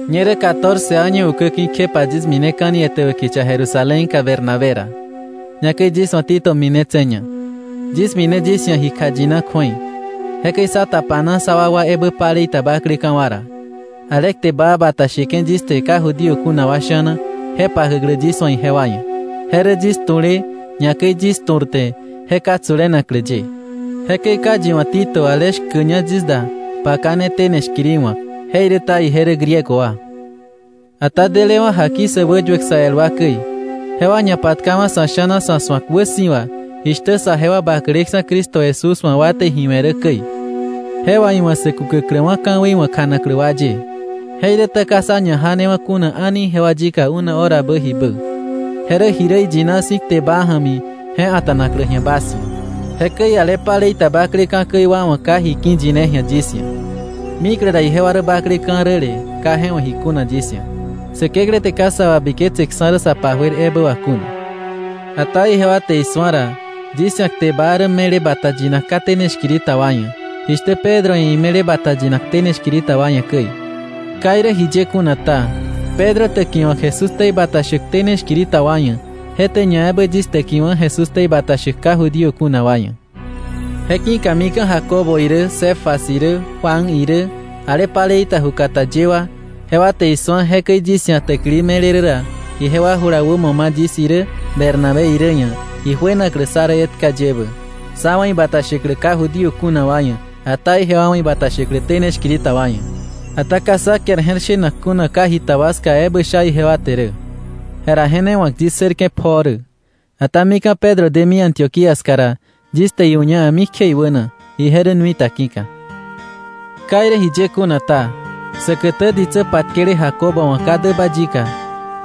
Ñerä catorce año ukäki̱ kjepa yis mineka̱ni etäbä kicha Jerusalénka Bernabé ra. Ñakäi yis wa̱ Tito minetse̱ña. Yis mine yis ia̱ ji kjayina kju̱ei. Jekäi sá tapana sa wakwa ebä palei ta bakleka̱ wa ra, ale kte baa bata sheke̱ yis te ka Judío kuna wa sha̱na, je pakäklä yis wa̱ ijewa ia̱. Je rä yis tu̱le, ñakäi yis tu̱rte, je ka tsulenaklä ye. Jekäi ka yi wa̱ Tito, ale shkäña yis da, pakane tene shkiri wa̱k. Jeiräta ije rä Griego wa. Ata delewa̱ jaki sä wäyuäk sä el wa käi, jewa ñapatkawa̱ sa̱ sha̱na sa̱ su̱ak wäsi̱wa jishtä saje wa bakleksa̱ Cristo Jesús wa̱ wa te ji we̱ rä käi, je wà iwa̱ sä kukäkläwa̱ ka̱wei wa̱ kjanaklä wa ye. Jeiräta ka sá ñajanewa̱ kuna a̱ni ijewa yika una horabä jibä. Je rä ji rä iyina si̱ kte baa ja̱mi, je a̱ta̱naklä ji̱a bas ia̱. Jekäi ale palei ta bakleka̱ käi wa wa̱ ka ji ki̱ yine ji̱a yis ia̱. Mikle ra ijewa rä bakleka̱ räle ka je wa̱ ji kuna yis ia̱, Säkeklä te ka sa wabiketseksa̱ rä sa pajuer ebä wà kuna. Ata ijewa te isu̱a ra, yis ia̱ kte baa rä me̱le bata yinak ka tene shkiri ta wa ia̱, jishtä Pedro ia̱ ime̱le bata yinak tene shkiri ta wa ia̱ käi. Ka irä jiye kuna ta, Pedro täkiwa̱k Jesús ktei bata shäk tene shkiri ta wa ia̱, je te ñaebä yis täkiwa̱ Jesús ktei bata shäk ka Judío kuna wa ia̱. Je ki̱ka mika̱ Jacobo irä Cefas irä Juan irä, ale palei ta ju kata ye wa, jewa te isu̱a jekäi yis ia̱ täkili me̱le rä ra, ijewa jula wämo ma̱ yis irä Bernabé irä ia̱ ijuenaklä sá rä etka ye ebä, sá wa̱ ibata shäklä ka Judío kuna wa ia̱, ata ije wa wa̱ ibata shäklä tene shkiri ta wa ia̱. Ata ka sá kiar je̱r shenak kuna ka jita wa ska ebä sha ijewa te rä. Jera je ne wa̱k yis ssërke̱ pjoo rä. Ata mika̱ Pedro demi Antioquía ska ra, yis te iu̱ña a̱mikje iwäna, ije rä nui ta ki̱ka. Ka irä jiye kuna ta, säkätä ditsä patkele Jacobo wa̱ ka däba yika,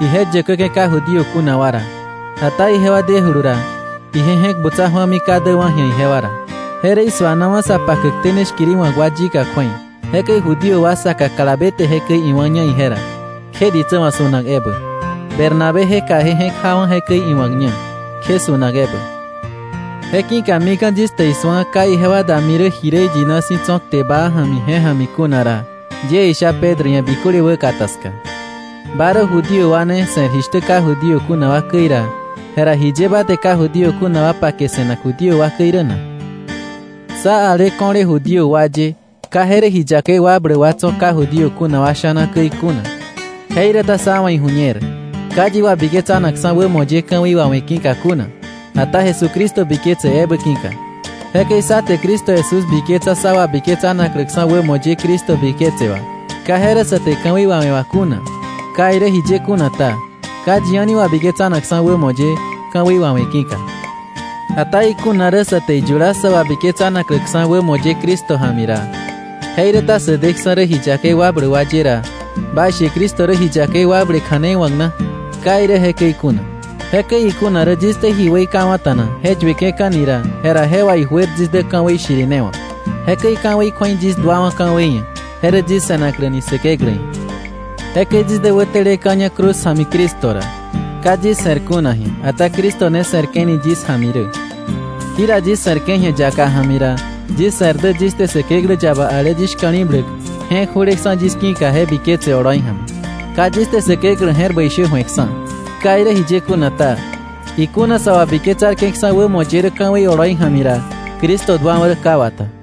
ije yäkäke̱ ka Judío kuna wa ra. Ata ijewa dejulu ra, ije je̱k butsa ju̱ami ka däkwa̱ ji̱a ijewa ra. Je rä isuanawa̱ sa pakäk tene shkiri wa̱k wa yika kju̱ei. Jekäi Judío wa saka kalabe te jekäi iwá̱ña ije ra, kje ditsä wa̱ su̱nak ebä, Bernabéje kaje je̱k jawa̱ jekäi iwa̱kña, kje su̱nak ebä. Je ki̱ka mika̱ yis te isu̱a ka ijewa dami rä ji rä iyina si̱ tso̱ kte baa ja̱mi je ja̱mi kuna ra, yie isha Pedro ia̱ biköle wäkata ska: “Ba rä Judío wa ne se̱r jishtä ka Judío kuna wa käi ra, jera ¿jiye ba te ka Judío kuna wa pake se̱nak Judío wa käi rä na?” Sá, ale ko̱le Judío wa ye, ka je rä ji yakei wakbläk wa tso̱ ka Judío kuna wa sha̱na käi kuna, jeiräta sá wa̱ iju̱ñer, ka yi wabiketsanakksa̱ wämo ye ka̱wei wawe̱ ki̱ka kuna, ata Jesucristo biketse ebä ki̱ka. Jekäi sá te Cristo Jesús biketsa sá wabiketsanakläksa̱ wämo ye Cristo biketse wà, ka je rä sa te ka̱wei wawe̱ wà kuna. Ka irä jiye kuna ta, ka yi a̱ni wabiketsanakksa̱ wämo ye ka̱wei wawe̱ ki̱ka. Ata ikuna rä sa te iyula sä wabiketsanakläksa̱ wämo ye Cristo ja̱mi ra, jeiräta sä deksa̱ rä ji yakei wakbläk wa ye ra, baishe ¿Cristo rä ji yakei wakble kja̱nei wa̱k na? ¡Ka irä jekäi kuna! Jekäi ikuna rä yis te ji weikawa̱ta̱na je yueke̱ka̱ni ra, jera je wà ijuer yis dä ka̱wei shirinewa̱k. Jekäi ka̱wei kju̱ei yis duawa̱ ka̱wei ia̱, je rä yis se̱nakläni Säkeklä ia̱. Jekäi yis dä wäteleka̱ña cruz ja̱mi Cristo ra. Ka yis se̱r kuna ji̱a, ata Cristo ne se̱rke̱ni yis ja̱mi rä. Jira yis se̱rke̱ ji̱a yaka ja̱mi ra, yis se̱r dä yis te Säkeklä yaba ale yis shka̱li̱bläk, je̱k ju̱leksa̱ yis ki̱ka, je biketse oloi ja̱mi. Ka yis te Säkeklä je̱r bäi shä ju̱eksa̱. Ka irä jiye kuna ta, ikuna sa wabiketsarke̱ksa̱ wämo ye rä ka̱wei oloi ja̱mi ra, Cristo duawa̱ rä ka wata.